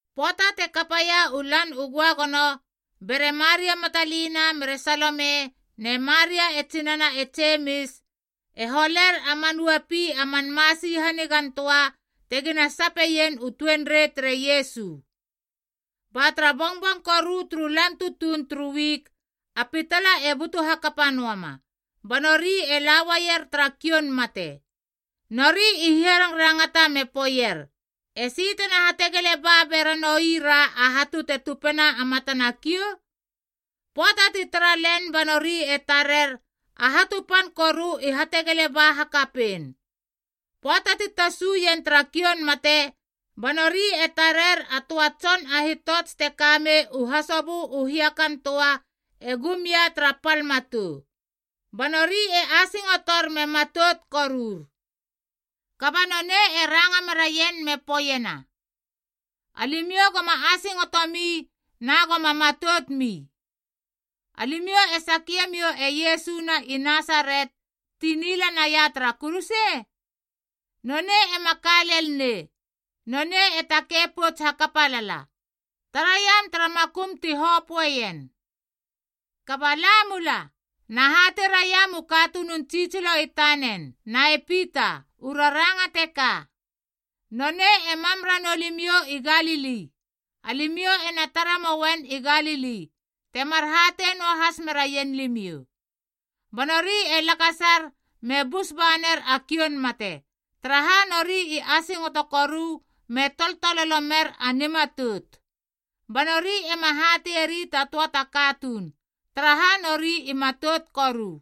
Pöata te kapaia u Lan u Göagono, bere Maria Matalina mere Salome ne Maria e tsinana e Jemis e holer a man uapi a man masi hanigantöa tegina sapeien u tuenrei tere Iesu. Ba tara bongbong koru turu lan tutuun turu wik, a pitala e butu hakapa noama, ba nori e la uaier tara kioun mate. Nori i hiarangrangata me poeier, “Esi tena hategele ba beranoi ra a hatu te tupena a matana kiou?” Pöata ti tara len ba nori e tarer, a hatu pan koru i hategele ba hakapein. Pöata ti tasuien tara kioun mate ba nori e tarer a töa tson a hitots te kamei u hasobö u hiakan töa e gumia tara pal matou. Ba nori e asingotor me matout korur. Kaba nonei e ranga meraien me poeiena, “Alimiou goma asingotomi na goma matoutmi. Alimiou e sakiemiou e Iesu na i Nasaret ti nila naia tara kuruse? Nonei ema ka lel nei. Nonei e takei pouts hakapa lala. Taraiam tara makum ti hopöeien. Kaba la mula, na hatei raiam u katunun tsitsilo i tanen na e Pita, u raranga teka: Nonei e mam ranou limiou i Galili, alimiou ena tare mouen i Galili, temar hatei noahas meraien limiou.” Ba nori e lakasar me bus ba ner a kioun mate, taraha nori i asingoto koru me toltololo mer a nimatout. Ba nori ema hateieri ta töa ta katuun, taraha nori i matout koru.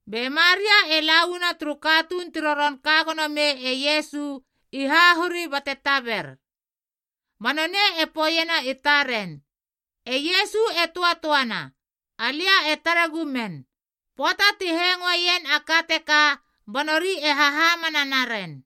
Be Maria e la uana turu katuun ti roron ka gono mei e Iesu i hahuri bate taber. Ba nonei e poeiena i taren, “E Iesu e töatöana, alia e tare gumen.” Pöata ti hengoeien a ka teka ba nori e hahamana naren.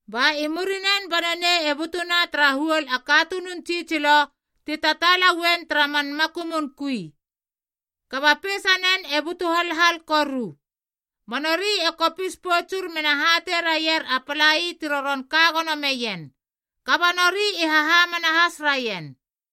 Ba i murinen ba nonei e butuna tara huol a katunun tsitsilo ti tataala uen tara man makumun kui, kaba peisanen e butu halhal koru. Ba nori e kopis poutsur mena hatei raier a palai ti roron ka gono meien. Kaba nori i hahamana has raien.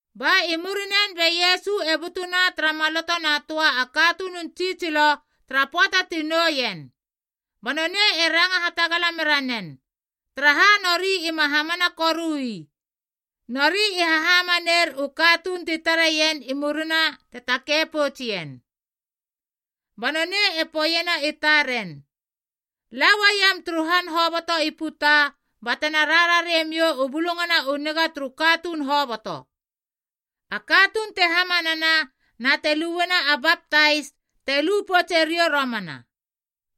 Ba i murinen be Iesu e butuna tara maloto na töa a katunun tsitsilo tara pöata ti nou ien. Ba nonei e ranga hatagala mera nen, taraha nori ima hamana korui, nori i hahamaneir u katuun ti tareien i murina te takei poutsien. Ba nonei e poeiena i taren, “La uaiam turu han hoboto i puta batena rarariemiou u Bulungana u Niga turu katuun hoboto. A katuun te hamanana na te lueiena a baptais te lu poutse riou romana.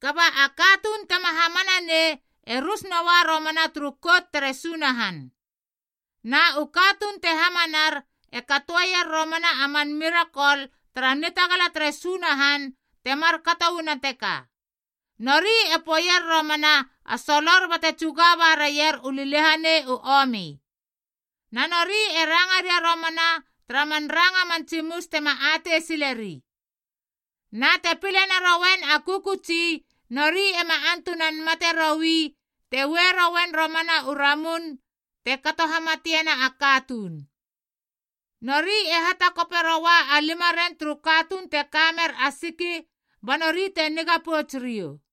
Kaba a katuun tema hamana nei e rus noa romana turu Kout tere Sunahan. Na u katuun te hamanar e katoeier romana a man mirakol tara nitagala tere Sunahan te markato uana teka: nori e poeier romana a solor bate tsuga ba raier u liliahanei u omi. Na nori e ranga ria romana tara man ranga man tsimus tema atei sileri. Na te pile naroien a kökötsi ba nori te ueier u ramun te kato hamatiena a katuun, nori ema antunan mate roi. Nori e hatakoperoua a limaren turu katuun te ka mer a siki ba nori te niga pouts riou.”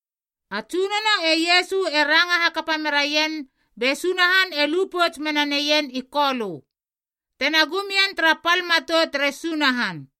A Tsunono e Iesu e ranga hakapa meraien be Sunahan e lu pouts mena neien i Kolö, tena gum ien tara pal matou tere Sunahan.